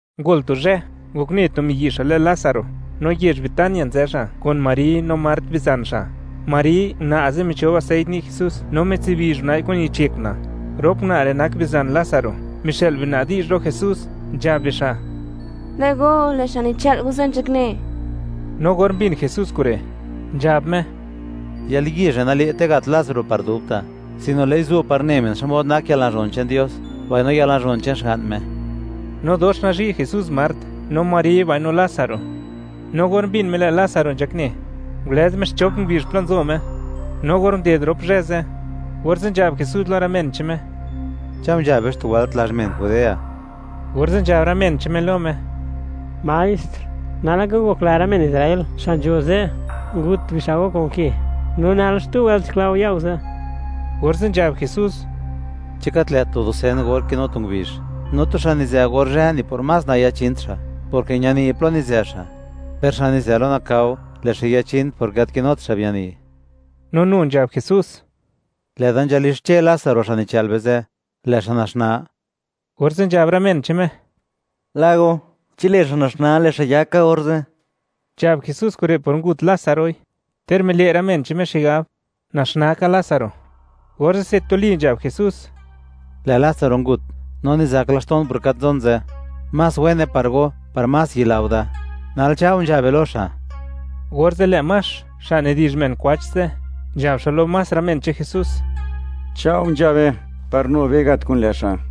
Ngol tu zhë, ngokne tu miyi' xa' lë Lásaro, no yezh Betania nzë xa' kun Mari no Mart, bizan xa'. Mari una' ze' michob aseit ni' Jesús no mitsibizh una'i kun yich yek una'. Rop una' re' nak bizan Lásaro, mixë'l biuna' razón lo Jesús, nzhab bixa': ―Lë' go, lë' xa' nichë'l go ze', nzhakne. No or mbin Jesús kure', nzhab Me: ―Yalyizh re' nale'te gat Lásaro par dubta', sino lë'i zu' par ne men, xmod nak yalnazhon che'n Dios, mbaino yalnazhon che'n Xga'n Me. No dox nazhi' Jesús Mart, no Mari, mbaino Lásaro. No or mbin Me, lë' Lásaro nzhakne, ngulëz Me xchop ngubizh plo nzo Me, no or nded rop zhë ze', orze' nzhab Jesús lo rë men che'n Me: ―Cha'o nzha be xtu wëlt lazh men Judea. Orze' nzhab rë men che'n Me lo Me: ―Maestr, nal laka ngokla rë men Israel xa' nzho ze', ngut bixa' go kun ke, ¿no nal xtu wëlt nzhakla go ya go ze'? Orze' nzhab Jesús: ―¿Chi gat lë't tu dusen or kinu tu ngubizh? No tu xa' nizë or zhë, ni por más nayachint xa', porke ñani plo nizë xa', per xa' nizë lo nakao, lë' xa' yachin, porke gat kinut xa' biani. No nu nzhab Jesús: ―Lë'da nzhalixche Lásaro, xa' nichë'l be ze', lë' xa' naxnaa. Orze' nzhab rë men che'n Me: ―Lë' go, chi lë' xa' naxnaa, lë' xa' yak ka orze'. Nzhab Jesús kure' por ngut Lázaroi, ter mile' rë men che'n Me xigab, naxnaa ka Lásaro, orze'se tuli nzhab Jesús: ―Lë' Lásaro ngut, no nizak laxto'n por gat nzon ze', más wene par go, par más yila go da. Nal cha' go, nzha be lo xa'. Orze' lë' Max, xa' nidi'zh men kwach ze', nzhab xa' lo más rë men che'n Jesús: ―Cha'o nzha be, par nu be gat kun lë' xa'.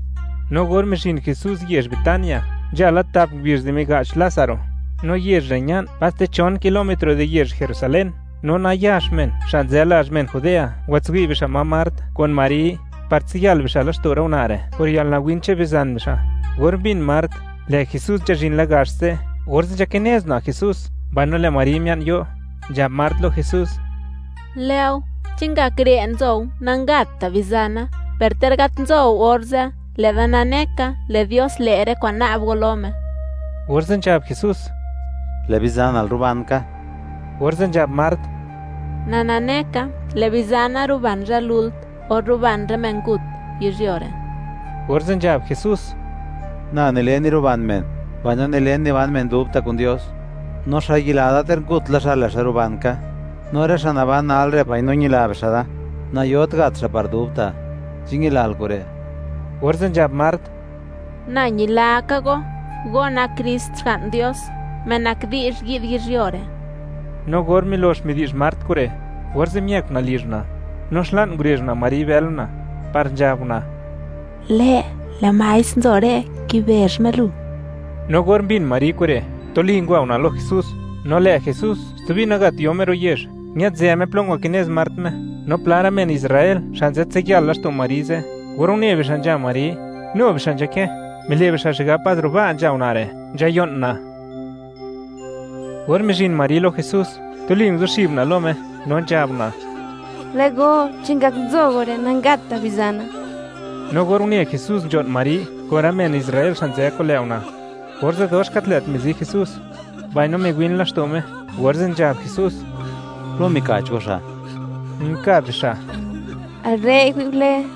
No or mizhin Jesús yezh Betania, nzha la tap ngubizh di miga'ch Lázaro. No yezh re' ña'n paste chon kilómetro di yezh Jerusalén, no nayax men xa' nzë lazh men Judea ngwatswi' bixa' ma Mart kun Mari, par tsiyal bixa' laxto' rë una' re' por yalnawin che'n bizan bixa'. Or mbin Mart, lë' Jesús nzhazhin la gax ze', orze' nzhakinez una' Jesús, mbaino lë' Mari mia'n yo'. Nzhab Mart lo Jesús: ―Lë' go, chi ngak re' nzou, nangatta' bizana, per ter gat nzou orze', lë'da nane ka, lë' Dios le' rë kwa'n na'b go lo Me. Orze' nzhab Jesús: ―Lë' bizanal ruban ka. Orze' nzhab Mart: ―Na nane ka, lë' bizana ruban zhë lult, or ruban rë men ngut, yizhyuo re'. Orze' nzhab Jesús: ―Na nile niruban men, mbaino nilen, niban men dubta' kun Dios; no xa' yila da, ter ngut la xa', lë' xa' ruban ka, no rë xa' naban nalre', mbaino ñila bixa' da, nayot gat xa' par dubta'. ¿Chi ñilal kure'? Orze' nzhab Mart: ―Na ñila ka Go. Go nak Krist, Xga'n Dios, Me nak di'zh yi'd yizhyuo re'. No or milox midi'zh Mart kure', orze' miëk una' lizh una', no xla'n ngurezh una' Mari bël una', par nzhab una': ―Lë', lë' maestr nzo re', kibezh Me lu. No or mbin Mari kure', tuli ngwa una' lo Jesús. No lë' Jesús stubi nagat yo Me ro' yezh, ñë'dzë Me plo ngwakinez Mart Me, no pla rë men Israel xa' nzhatsiyal laxto' Mari ze', or une bixa' nzha Mari, nu bixa' nzhakë, mile' bixa' xigab pas ro' ba' nzha una' re', nzhayo'n una'. Or mizhin Mari lo Jesús, tuli nguzuxib una' lo Me, no nzhab una': ―Lë' go, chi ngak nzo go re', nangatta' bizana. No or une Jesús nzho'n Mari kun rë men Israel xa' nzë kun lë' una', orze' dox gat lë' mizi Jesús, mbaino miwin laxto' Me, orze' nzhab Jesús: ―¿Plo mika'ch go xa'? Nkab bixa': ―Al re'i, wi'gole.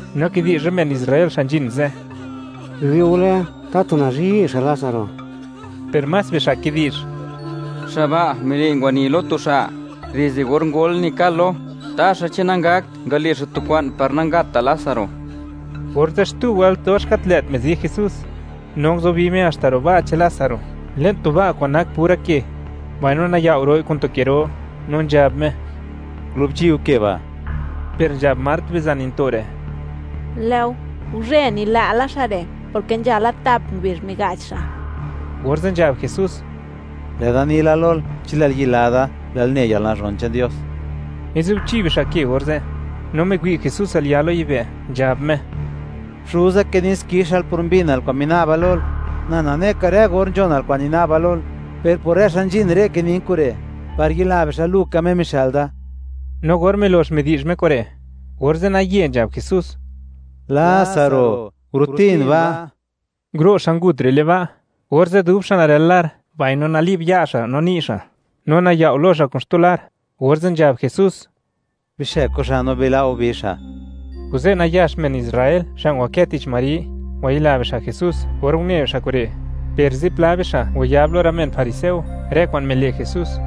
no kidi'zh rë men Israel xa' nzhin ze': ―Biwi'ule, tatu nazhi' xa' Lásaro. Per más bixa' kidi'zh: ―Xa' ba' mile' ngwani lo tu xa' dizde or ngol nikal-lo; ¿taxa, chi nangakt ngale' xa' tu kwa'n par nangatta' Lásaro? Orze', xtu wëlt dox gat lë't mizi Jesús, no nguzubi Me haxta ro' ba' che'n Lásaro, le'n tu ba' kwa'n nak pura ke, mbaino nayao' ro'i kun tu ke ro, no nzhab Me: ―Gure go ke ba'. Per nzhab Mart bizan yinto' re': ―Lë' go, guzhë nila' xa' re', porke nzha la tap ngubizh miga'ch xa'. Orze' nzhab Jesús: ―Lë'da ni la lol, chi lë'l yila da, lë'l ne yalnazhon che'n Dios. Ngure bixa' ke orze', no miwi' Jesús al ya' lo yibë', nzhab Me: ―Xuza, kinin xkixal por mbinal kwa'n mina'ba lol. Na nane ka, rë or nzhonal kwa'n nina'ba lol, per por rë xa' nzhin re' kinin kure', par yila bixa', Lu ka Me mixë'l da. No or milo'x midi'zh Me kure', orze' naye nzhab Jesús: ―¡Lásaro, gurutin ba'! Nguro' xa' ngut re' le'n ba' orze', dub xa' narël lar, mbaino nali'b ya' xa' no ni' xa', no nayao' lo xa' kun xtu lar, orze' nzhab Jesús: ―Bixëk go xa' no bila' go bi xa'. Kuze' nayax men Israel xa' ngwakë tich Mari, ngwayila bixa' Jesús, or une bixa' kure', per zipla bixa' ngwayab lo rë men fariseo rë kwa'n mile' Jesús,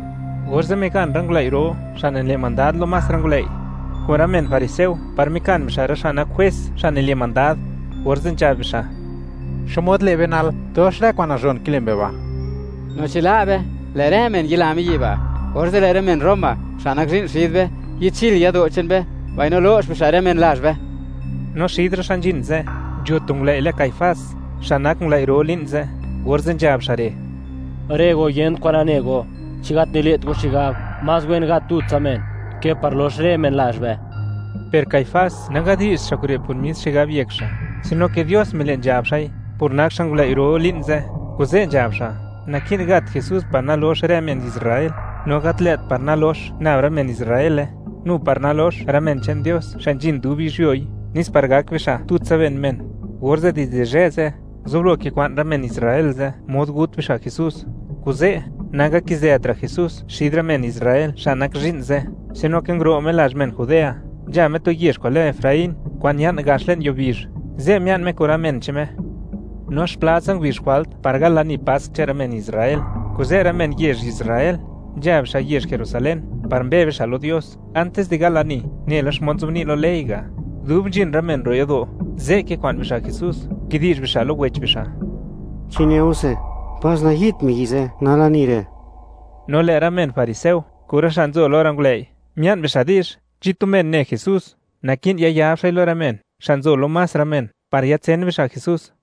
orze' migan rë ngulëi' ro xa' nile' mandad lo más rë ngulëi', kun rë men fariseo par mikan bixa' rë jwes, xa' más nile' mandad, orze' nzhab bixa': ―¿Xmod le' be nal? ¡Dox rë kwa'n nazhon kile' mbe ba'!, no chi la' be, lë' rë men yila miyi' ba', orze' lë' rë men Roma, xa' nak zhi'n xid be, yi'dchil yado' che'n be mbaino lo'x bixa' rë men lazh be. No xid rë xa' nzhin ze', nzho tu ngulëi' lë Caifás, xa' nak ngulëi' ro li'n ze', orze' nzhab xa' re': ―Rë go, yent kwan nane go, ¿chi gat nile't go xigab, más wen gat tutsa men ke par lox rë men lazh be? Per Caifás nangadi'zht xa' kure' por mis xigab yek xa', sino ke Dios mile' nzhab xa'i, por nak xa' ngulëi' ro li'n ze', kuze' nzhab xa', naki'n gat Jesús par nalox rë men Israel, no gat lë't par nalox nab rë men Israele, nu par nalox rë men che'n Dios xa' nzhin dub yizhyuoi, nes par gak bixa' tutsa ben men. Orze', dizde zhë ze', nguzublo kikwa'n rë men Israel ze' mod gut bixa' Jesús. Kuze', nangakizëtra' Jesús xid rë men Israel xa' nak zhi'n ze', sino ke nguro' Me lazh men Judea, nzha Me tu yezh kwa'n lë Efraín, kwa'n ña'n gax le'n yuo bizh; ze' mia'n Me kun rë men che'n Me, no xplatsa ngubizh jwalt antis di gal lani Pask che'n rë men Israel, kuze' rë men yezh Israel, nzha bixa' yezh Jerusalén par mbe bixa' lo Dios antis de gal lani, nela xmod nzobni' lo ley ga'. Dub nzhin rë men ro' yado', ze' kikwa'n bixa' Jesús, kidi'zh bixa' lo wech bixa': ―¿Chi neuse, pas nayi'dt miyi' ze' nal lani re'? No lë' rë men fariseo kun rë xa' nzo lo rë ngulëi', mia'n bixa' di'zh, chi tu men ne Jesús, naki'n yayab xa'i lo rë men xa' nzo lo más rë men par yatsen bixa' Jesús.